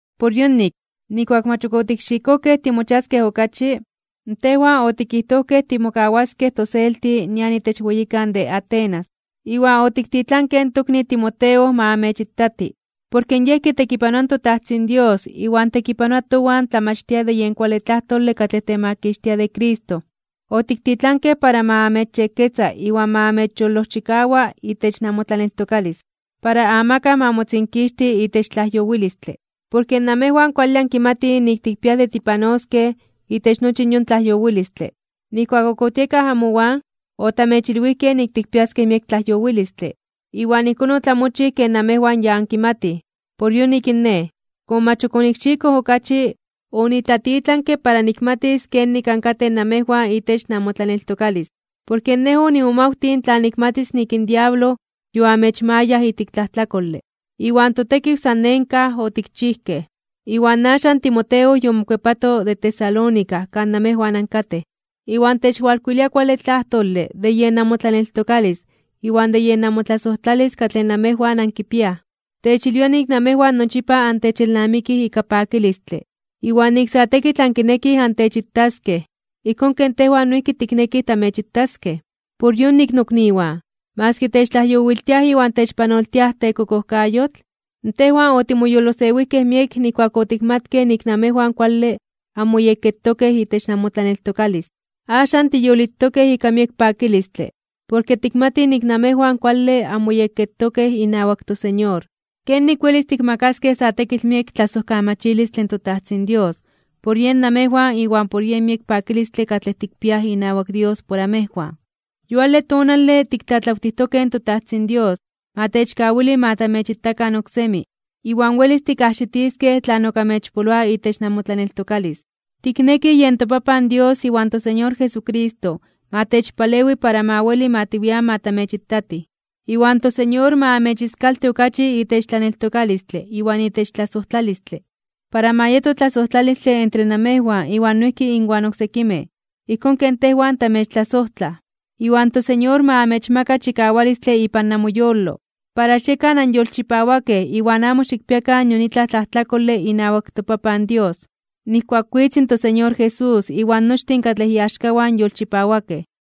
Por yonik, nijkuak mach ok otikxikojkej timochiaskej okachi, tejwan otikijtojkej timokawaskej toselti nian itech weyikan de Atenas, iwan otiktitlankej in tokni Timoteo ma amechitati, porke yej kitekipanoa in toTajtzin Dios iwan tekipanoa towan tlamachtia de yen kuale tlajtole katlej temakixtia de Cristo. Otiktitlankej para ma amechyekketza iwan ma amechyolojchikawa itech namotlaneltokalis, para amakaj ma motzinkixti itech tlajyowilistle. Porke namejwan kuale ankimatij nik tikpiaj de tipanoskej itech nochi yon tlajyowilistle. Nijkuak ok otiekaj amowan, otamechilwijkej nik tikpiaskej miek tlajyowilistle. Iwan ijkón otlamochij ken namejwan ya ankimatij. Por yonik in nej, komo mach ok onikxikoj okachi, onitlatitlanke para nikmatis kenik ankatej namejwan itech namotlaneltokalis. Porke nej onimomawtij tla nikmatis nik in diablo yoamechmayaj ijtik tlajtlakole, iwan totekiw san nenkaj (en vano) otikchijkej. Pero axan in Timoteo yomokuepato de Tesalónica kan namejwan ankatej, iwan techwalkuilia kuale tlajtole (rason) de yen namotlaneltokalis iwan de yen namotlasojtlalis katlej namejwan ankipiaj. Techilwia nik namejwan nochipa antechelnamikij ika pakilistle, iwan nik sa tekitl ankinekij antechitaskej, ijkón ken tejwan noijki tiknekij tamechitaskej. Por yonik, nokniwan, maski techtlajyowiltiaj iwan techpanoltiaj tekokojkayotl, tejwan otimoyolosewijkej miek nijkuak otikmatkej nik namejwan kuale anmoyekketokej itech namotlaneltokalis. Axan tiyolitokej ika miek pakilistle porke tikmatij nik namejwan kuale anmoyekketokej inawak toSeñor. ¿Kenik welis tikmakaskej sa tekitl miek tlasojkamachilistle in toTajtzin Dios por yen namejwan iwan por yen miek pakilistle katlej tikpiaj inawak Dios por amejwan? Yuale tonale tiktlatlawtijtokej in toTajtzin Dios ma techkawili ma tamechitakan oksemi, iwan welis tikajxitiskej tlan ok amechpoloa itech namotlaneltokalis. Tiknekij yen toPapan Dios iwan toSeñor Jesucristo ma techpalewi para ma weli ma tiwian ma tamechitatij. Iwan toSeñor ma amechiskalti okachi itech tlaneltokalistle iwan itech tlasojtlalistle, para ma yeto tlasojtlalistle entre amejwan iwan noijki inwan oksekimej, ijkón ken tejwan tamechtlasojtlaj. Iwan toSeñor ma amechmaka chikawalistle ipan namoyolo, para xiekan anyolchipawakej iwan amo xikpiakan nion itlaj tlajtlakole inawak toPapan Dios, nijkuak witz in toSeñor Jesús iwan nochtin katlej iaxkawan yolchipawakej.